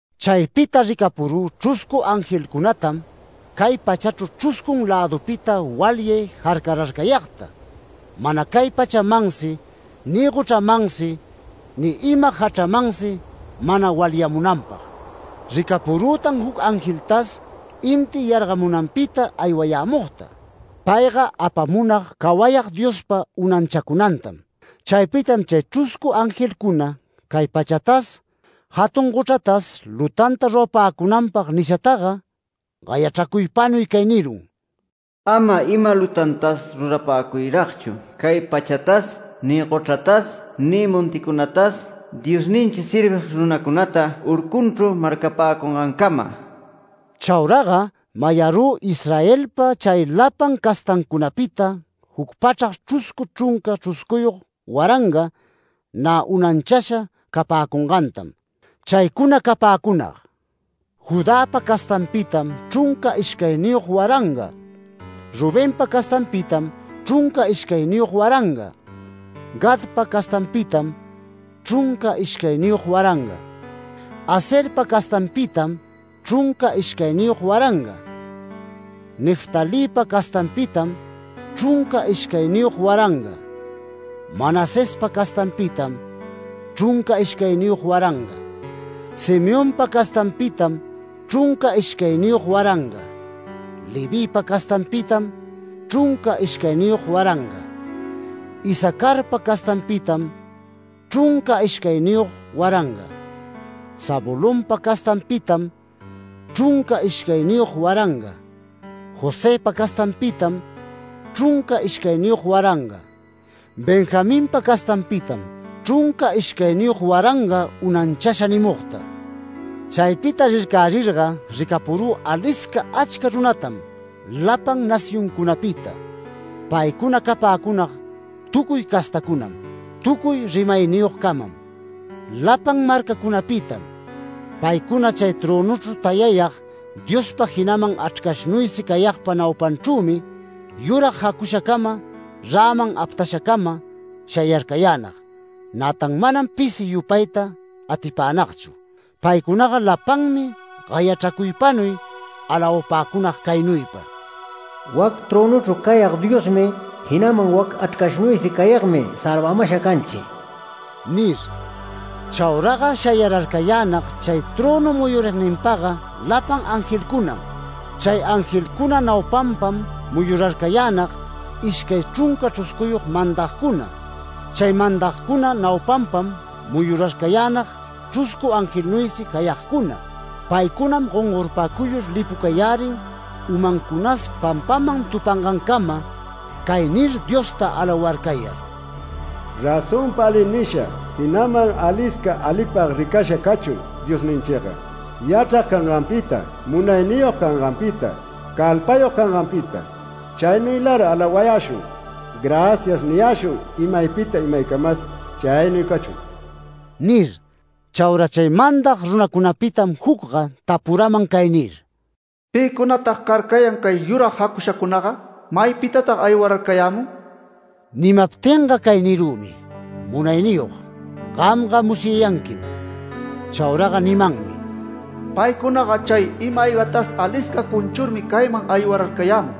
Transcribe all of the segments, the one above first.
Chaypita ricapurü chruscu angelcunatam, cay pachachru chruscun lädupapita walyay jarcararcayagta, mana cay pachamansi, ni gochramansi, ni ima jachramansi mana walyamunanpag. Ricapurütan juc angeltas inti yargamunanpita aywayämugta. Payga apamunag cawayag Diospa unanchacunantam. Chaypitam chay chruscu angelcuna cay pachatas, jatun gochratas lutanta rurapäcunanpag nishataga, gayachracuypanuy cay nirun: “Ama ima lutantas rurapäcuyragchu cay pachatas, ni gochratas, ni monticunatas Diosninchi servig runacunata urcunchru marcapäcamungancama”. Chauraga mayarü “Israelpa chay lapan castancunapita, juc pachrac, chruscu chrunca chruscuyog waranga, nä unanchasha capäcungantam. Chaycuna capäcunag: Judäpa castanpitam chrunca ishcayniyog waranga Rubenpa castanpitam chrunca ishcayniyog waranga Gadpa castanpitam chrunca ishcayniyog waranga Aserpa castanpitam chrunca ishcayniyog waranga Neftalïpa castanpitam chrunca ishcayniyog waranga Manasespa castanpitam chrunca ishcayniyog waranga Simeonpa castanpitam chrunca ishcayniyog waranga Levïpa castanpitam chrunca ishcayniyog waranga Isacarpa castanpitam chrunca ishcayniyog waranga Zabulonpa castanpitam chrunca ishcayniyog waranga Josëpa castanpitam chrunca ishcayniyog waranga Benjaminpa castanpitam chrunca ishcayniyog waranga unanchasha” nimugta. Chaypita rircärirga ricapurü alisca achca runatam lapan nacioncunapita. Paycuna capäcunag tucuy castacunam, tucuy rimayniyogcamam, lapan marcacunapitam. Paycuna chay trönuchru tayayag Diospa, jinaman Achrcashnuysi cayagpa naupanchrümi, yurag jacushacama, räman aptashacama shayarcayänag. Nätan manam pisi yupayta atipänagchu. Paycunaga lapanmi gayachracuypanuy alawapäcunag caynuypa: “Wac trönuchru cayag Diosmi, jinaman wac Achrcashnuysi cayagmi salvamasha canchi” nir. Chauraga shayararcayänag chay trönu muyurigninpaga lapan angelcunam. Chay angelcuna naupanpam muyurarcayänag ishcay chrunca chruscuyog mandacuna. Chay mandagcuna naupanpam muyurarcayänag chruscu angelnuysi cayagcuna. Paycunam gongorpacuyur lipucayärin umancunas pampaman tupangancama cay nir Diosta alawarcayar: “Razonpa ali nisha, jinaman alisca alipag ricasha cachun Diosninchiga, yachrag canganpita, munayniyog canganpita, calpayog canganpita. Chaynuylar alawayäshun, ‘Gracias’ niyäshun imaypita imaycamas. Chaynuy cachun” nir. Chaura chay mandag runacunapitam jucga tapuraman cay nir: “¿Pïcunatag carcayan cay yurag jacushacunaga? ¿Maypitatag aywararcayämun?” Nimaptinga cay nirümi: “Munayniyog, gamga musyayanquim”. Chauraga nimanmi: “Paycunaga chay ima-aygatas alisca cunchurmi cayman aywararcayämun,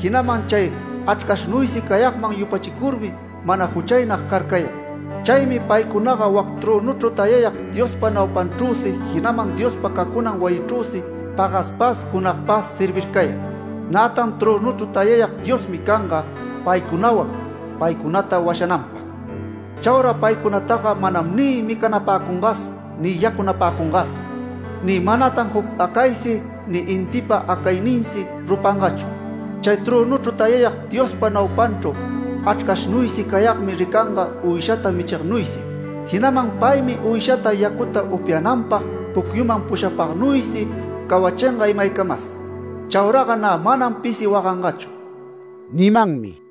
jinaman chay Achrcashnuysi cayagman yupachicurmi mana juchaynag carcayan. Chaymi paycunaga wac trönuchru tayayag Diospa naupanchrüsi, jinaman Diospa cacunan wayichrüsi, pagaspas junagpas servircayan. Nätan trönuchru tayayag Diosmi canga paycunawan, paycunata washananpag. Chaura paycunataga manam ni micanapäcungas ni yacunapäcungas, ni manatan juc acaysi ni intipa acayninsi rupangachu. Chay trönuchru tayayag Diospa naupanchru Achrcashnuysi cayagmi ricanga uyshata michignuysi. Jinaman paymi uyshata yacuta upyananpag pucyuman pushapagnuysi cawachinga imaycamas. Chauraga nä manam pisi wagangachu” nimanmi.